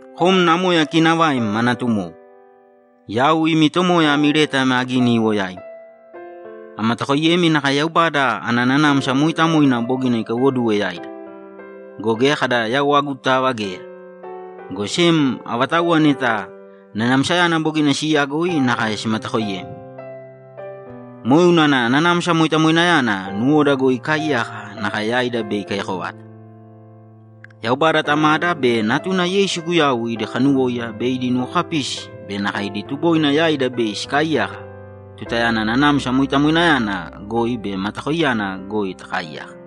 Kom namoya kiinavaim ma natumowo, Yau imi tomoya ami leta ame agini iwo yaimi. Amatakoiyemi nakae Yaubada ana Nanamsa Mooitamoina bogina ikaiwoduwe yaida. Go geya kada yau agutava geya, go sem avatauwa neta Nanamsayana bogina siiyagoi nakae simatakooiyemi. Moe unana Nanamsa Moitamoinayana nuwoda goi ikaaiyaka nakae yaida bei ikaiyako vata. Yaubada Tamada be Natuna Yeisu Guyau idi kanuwóiya be idi nuwokapisi be nakae idi tuboina yaida bei sikaaiyaka tutayana Nanamsa Moitamoinayana goi be matakoiyana goi takaaiyaka.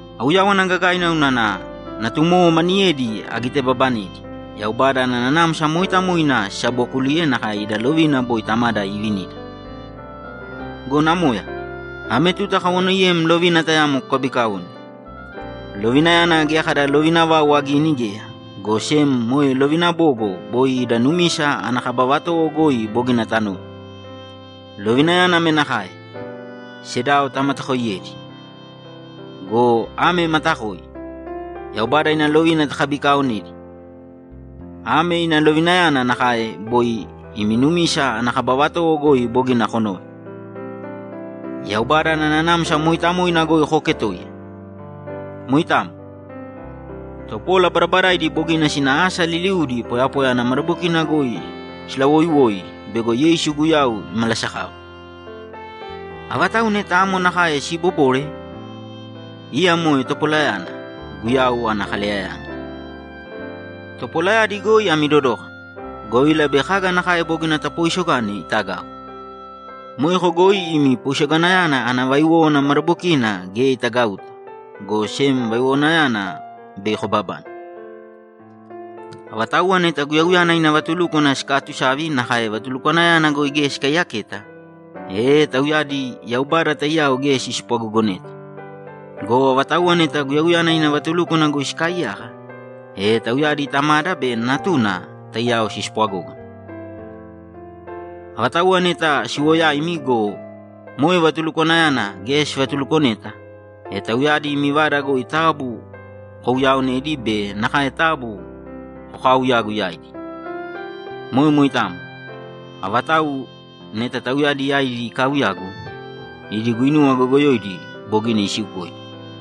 Auyáwana gagaina unana natumowo maniyedi agitebabanedi, Yaubada ana Nanamsa Mooitamoina sisabookuliye nakae ida lovina boi Tamada iivinida. Go namoya, ame tuta akawanoiyem lovina tayamo kukabiikaōne. Lovinayana geya kada lovina vau agini geya, go sem moe lovina bogo boi ida numisa ana kaba vatowo goi bogina tanove. Lovinayana ame nakae: Sedao tamatakooiyēdi. Go ame matakoi: Yaubada ina lovina takabikaonedi. Ame ina lovinayana nakae boi imi numisa ana kaba vatowo goi bogina konove: Yaubada ana Nanamsa Mooitamoina goi kooketōiya. Moitamo. Topola badabadaidi bogina sina asa liliudi poyapoya ana madabokina goi silawooiwoi bego Yeisu Guyau imalasakava. Avatau neta amo nakae siibobore, iya moe topolayana, Guyau ana kaleyayana. Topolayadi goi ami dodōkana, govila bei kaga nakae bogina tapooisogane itagau. Moeko goi imi poisoganayana ana vaiwówana madabokina geya itagauta, go sem vaiwowanayana bei kobabane. Avatauwa neta Guyauyana ina vatulúkwana sikaatusavi nakae vatulukwanayana goi geya sikaiyaketa, e tauyadi Yaubada taiyao geya sispwagogoneta. Go avatauwa neta Guyauyana ina vatulúkwana goi sikaaiyaka, e tauyadi Tamada be Natuna taiyao sispwagógana. Avatauwa neta siwo yaimi go, moe vatulukwanayana geya sivatulukoneta, e tauyadi imi vada goi taabu kouyaaonēdi be nakae taabu kokaauyāgu yaidi. Moe moitamo. Avatau neta tauyadi yaidi ikaauyagu, idi guinuwa goyogoyoidi bogina isiukoidi.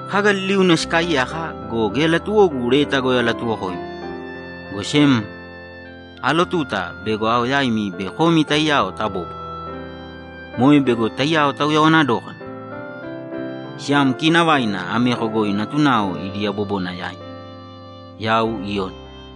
Kaga liliuna sikaaiyaka go, geya latuwogu leta goi alatuwokoimi, go sem aalotuta bego ao yaimi bei komi taiyao tabóbwara. Moe bego taiyao tauyawana dókana. Siyam kiinavaina ameko goi natunao idi yabobona yaim. Yau Iyoni